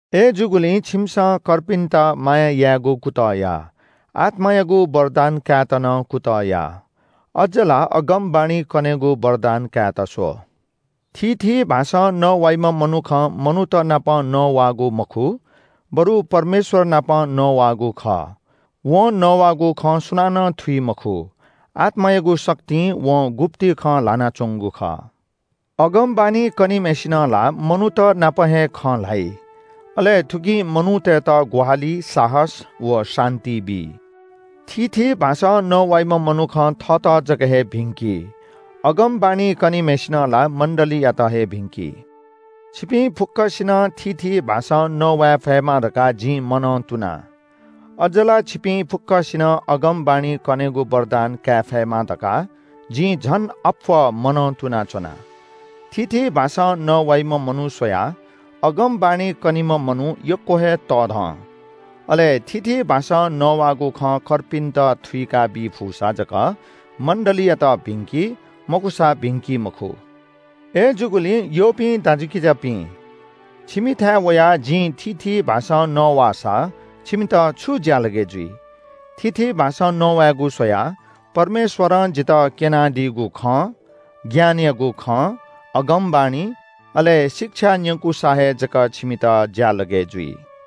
अय्‌जूगुलिं छिमिसं कर्पिन्‍त माया यायेगु कुतः या। आत्‍मायागु वरदान कायेत नं कुतः या। अज्‍ज ला अगमवाणी कनेगु वरदान कायेत स्‍व। थीथी भाषां नवाइम्‍ह मनुखं मनूत नाप नवाःगु मखु बरु परमेश्‍वर नाप नवाःगु खः। वं नवाःगु खँ सुनानं थुइ मखु। आत्‍मायागु शक्तिं वं गुप्‍ति खँ ल्‍हानाच्‍वंगु खः। अगमवाणी कनीम्‍हय्‌सिनं ला मनूत नाप हे खँ ल्‍हाइ, अले थुकिं मनूतय्‌त ग्‍वाहालि, साहस व शान्‍ति बी। थीथी भाषां नवाइम्‍ह मनुखं थःत जक हे भिंकी, अगमवाणी कनीम्‍हय्‌सिनं ला मण्‍डलीयात हे भिंकी। छिपिं फुक्‍कसिनं थीथी भाषां नवाये फयेमा धकाः जिं मनंतुना। अज्‍ज ला छिपिं फुक्‍कसिनं अगमवाणी कनेगु वरदान काये फयेमा धकाः जिं झन अप्‍वः मनं तुनाच्‍वना। थीथी भाषां नवाइम्‍ह मनू स्‍वयाः अगमवाणी कनीम्‍ह मनू यक्‍व हे तःधं। अले थीथी भाषां नवाःगु खँ कर्पिन्‍त थुइकाबी फुसा जक मण्‍डलीयात भिंकी, मखुसा भिंकी मखु। अय्‌जूगुलिं यःपिं दाजुकिजापिं, छिमिथाय् वयाः जिं थीथी भाषां नवाःसा छिमित छु ज्‍यालगय् जुइ? थीथी भाषां नवायेगु स्‍वयाः परमेश्‍वरं जितः क्‍यनादीगु खँ, ज्ञानयागु खँ, अगमवाणी, अले शिक्षा न्‍यंकुसा हे जक छिमित ज्‍यालगय् जुइ।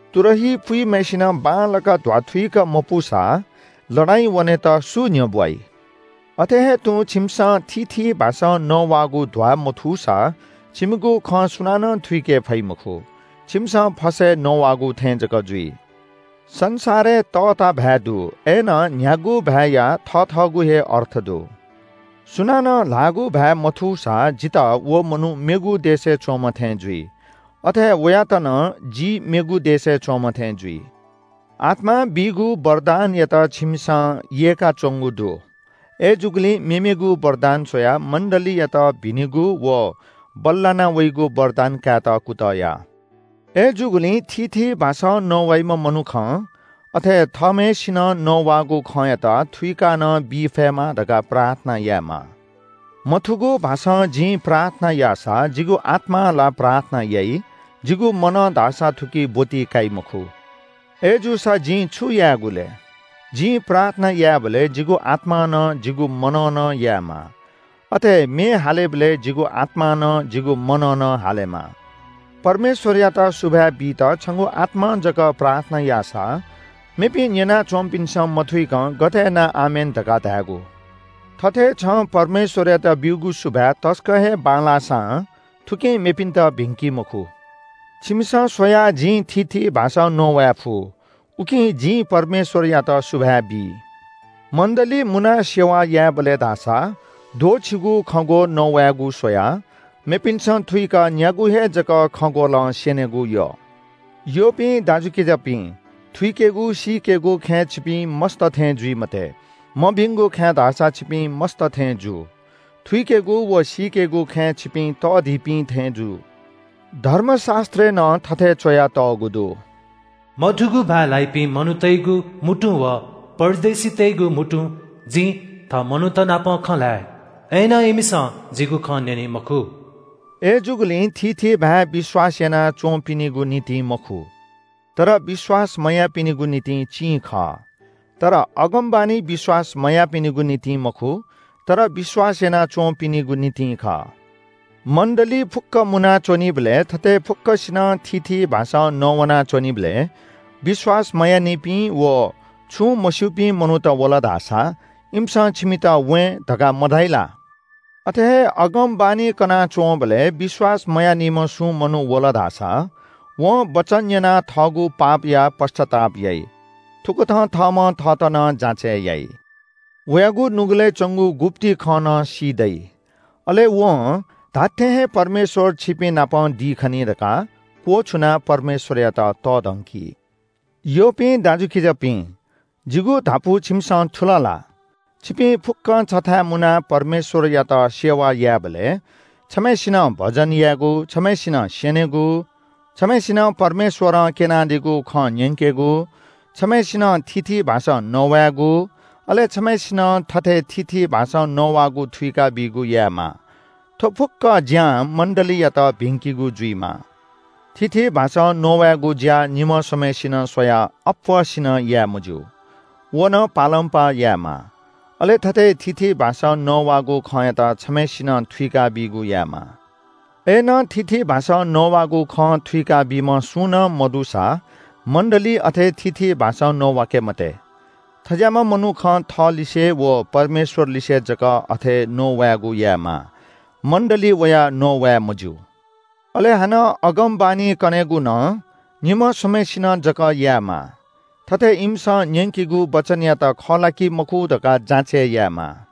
तुरही पूम्‍हय्‌सिनं बांलाक ध्‍वाथुइक मपूसा लडाइँ याःवनेत सु न्‍ह्यब्‍वाइ? अथे हे तुं छिमिसं थीथी भाषां नवाःगु ध्‍वामथूसा छिमिगु खँ सुनानं थुइके फइ मखु। छिमिसं फसय् नवाःगु थें जक जुइ। संसारय् तःता भाय् दु, अय्‌नं न्‍ह्यागु भाय्‌या थथःगु हे अर्थ दु। सुनानं ल्‍हाःगु भाय् मथूसा जितः व मनू मेगु देशय् च्‍वंम्‍ह थें जुइ, अथे हे वयात नं जि मेगु देशय् च्‍वंम्‍ह थें जुइ। आत्‍मां बीगु वरदानयात छिमिसं यय्‌काच्‍वंगु दु। अय्‌जूगुलिं मेमेगु वरदान स्‍वयाः मण्‍डलीयात भिनिगु व बल्‍लाना वइगु वरदान कायेत कुतः या। अय्‌जूगुलिं थीथी भाषां नवाइम्‍ह मनुखं अथे थःम्‍हय्‌सिनं नवानागु खँयात थुइका नं बी फयेमा धकाः प्रार्थना यायेमाः। मथूगु भाषां जिं प्रार्थना याःसा जिगु आत्‍मां ला प्रार्थना याइ, जिगु मनं धाःसा थुकी ब्‍वति काइ मखु। अय्‌जूसा जिं छु यायेगु लय्? जिं प्रार्थना यायेबलय् जिगु आत्‍मां नं जिगु मनं नं यायेमाः। अथे हे म्‍ये हालेबलय् जिगु आत्‍मां नं जिगु मनं नं हालेमाः। परमेश्‍वरयात सुभाय् बीत छंगु आत्‍मां जक प्रार्थना याःसा मेपिं न्‍यना च्‍वंपिन्‍सं मथुइकं गथे यानाः “आमेन” धकाः धायेगु? थथे छं परमेश्‍वरयात ब्‍यूगु सुभाय् तसकं हे बांलाःसां थुकिं मेपिन्‍त भिंकी मखु। छिमिसं स्‍वयाः जिं थीथी भाषां नवाये फु, उकिं जिं परमेश्‍वरयात सुभाय् बी। मण्‍डली मुनाः सेवा यायेबलय् धाःसा द्वःछिगू खँग्‍वः नवायेगु स्‍वयाः मेपिन्‍सं थुइक न्‍यागू हे जक खँग्‍वलं स्‍यनेगु यः। यःपिं दाजुकिजापिं, थुइकेगु सीकेगु खँय् छिपिं मस्‍त थें जुइ मते। मभिंगु खँय् धाःसा छिपिं मस्‍त थें जु। थुइकेगु व सीकेगु खँय् छिपिं तःधिपिं थें जु। धर्मशास्‍त्रय् नं थथे च्‍वयातःगु दु – “मथूगु भाय् ल्‍हाइपिं मनूतय्‌गु म्‍हुतुं व परदेशीतय्‌गु म्‍हुतुं जिं थः मनूतनापं खँ ल्‍हाये। अय्‌नं इमिसं जिगु खँ न्‍यनी मखु।” अय्‌जूगुलिं थीथी भाय् विश्‍वास याना च्‍वंपिनिगु निंतिं मखु, तर विश्‍वास मयाःपिनिगु निंतिं चिं खः। तर अगमवाणी विश्‍वास मयाःपिनिगु निंतिं मखु, तर विश्‍वास याना च्‍वंपिंनिगु निंतिं खः। मण्‍डलीइ फुक्‍क मुना च्‍वनीबलय् थथे फुक्‍कसिनं थीथी भाषां नवाना च्‍वनीबलय् विश्‍वास मयाःनिपिं व छुं मस्‍यूपिं मनूत वल धाःसा इमिसं छिमित “वें” धकाः मधाइ ला? अथे हे अगमवाणी कनाच्‍वंबलय् विश्‍वास मयाःनिम्‍ह सुं मनू वल धाःसा वं वचन न्‍यनाः थःगु पापया पश्‍चाताप याइ। थुकथं थःम्‍हं थःत नं जाँचय् याइ। वयागु नुगलय् च्‍वंगु गुप्‍ति खँ नं सी दइ। अले वं “धात्‍थें हे परमेश्‍वर छिपिंनाप दी खनी” धकाः क्‍वछुनाः परमेश्‍वरयात तःधंकी। यःपिं दाजुकिजापिं, जिगु धापू छिमिसं थुल ला? छिपिं फुक्‍कं छथाय् मुनाः परमेश्‍वरयात सेवा यायेबलय् छम्‍हय्‌सिनं भजन यायेगु, छम्‍हय्‌सिनं स्‍यनेगु, छम्‍हय्‌सिनं परमेश्‍वरं क्‍यनादीगु खँ न्‍यंकेगु, छम्‍हय्‌सिनं थीथी भाषां नवायेगु, अले छम्‍हय्‌सिनं थथे थीथी भाषां नवाःगु थुइकाबीगु यायेमाः। थ्‍व फुक्‍क ज्‍यां मण्‍डलीयात भिंकिगु जुइमाः। थीथी भाषां नवायेगु ज्‍या निम्‍ह स्‍वम्‍हय्‌सिनं स्‍वयाः अप्‍वःसिनं याये मज्‍यू। व नं पालंपाः यायेमाः। अले थथे थीथी भाषां नवाःगु खँयात छम्‍हय्‌सिनं थुइकाबीगु यायेमाः। अय्‌नं थीथी भाषां नवाःगु खँ थुइका बीम्‍ह सुं नं मदुसा मण्‍डलीइ अथे थीथी भाषां नवाके मते। थज्‍याःम्‍ह मनुखं थःलिसे व परमेश्‍वरलिसे जक अथे नवायेगु यायेमाः, मण्‍डलीइ वयाः नवाये मज्‍यू। अले हानं अगमवाणी कनेगु नं निम्‍ह स्‍वम्‍हय्‌सिनं जक यायेमाः। थथे इमिसं न्‍यंकीगु वचनयात खः ला कि मखु धकाः जाँचय् यायेमाः।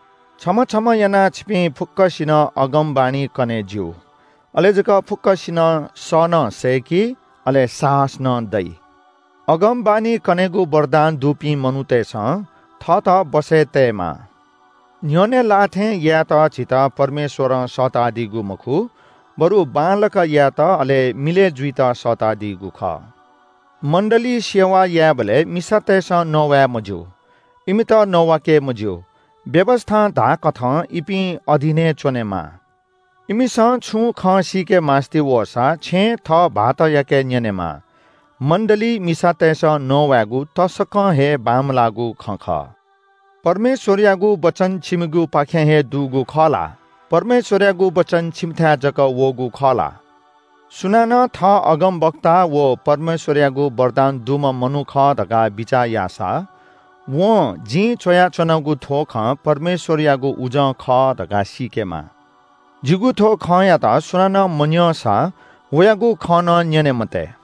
छम्‍ह छम्‍ह यानाः छिपिं फुक्‍कसिनं अगमवाणी कने ज्‍यू। अले जक फुक्‍कसिनं स नं सय्‌की, अले साहस नं दइ। अगमवाणी कनेगु वरदान दुपिं मनूतय्‌सं थःत बसय् तयेमाः। न्‍ह्यःने लाः थें यायेत झीत परमेश्‍वरं सःतादीगु मखु बरु बांलाक यायेत अले मिलय् जुइत सःतादीगु खः। मण्‍डलीइ सेवा यायेबलय् मिसातय्‌सं नवाये मज्‍यू। इमित नवाके मज्‍यू। व्‍यवस्‍थां धाःकथं इपिं अधीनय् च्‍वनेमाः। इमिसं छुं खँ सीकेमास्‍ति वःसा छेँय् थः भाःतयाके न्‍यनेमाः। मण्‍डलीइ मिसातय्‌सं नवायेगु तसकं हे बांमलाःगु खँ खः। परमेश्‍वरयागु वचन छिमिगुपाखें हे दुगु खः ला? परमेश्‍वरयागु वचन छिमिथाय् जक वःगु खः ला? सुनानं थः अगमवक्ता व परमेश्‍वरयागु वरदान दुम्‍ह मनू खः धकाः बिचाः याःसा वं जिं च्‍वयाच्‍वनागु थ्‍व खँ परमेश्‍वरयागु उजं खः धकाः सीकेमाः। जिगु थ्‍व खँयात सुनानं मन्‍यंसा वयागु खँ नं न्‍यने मते।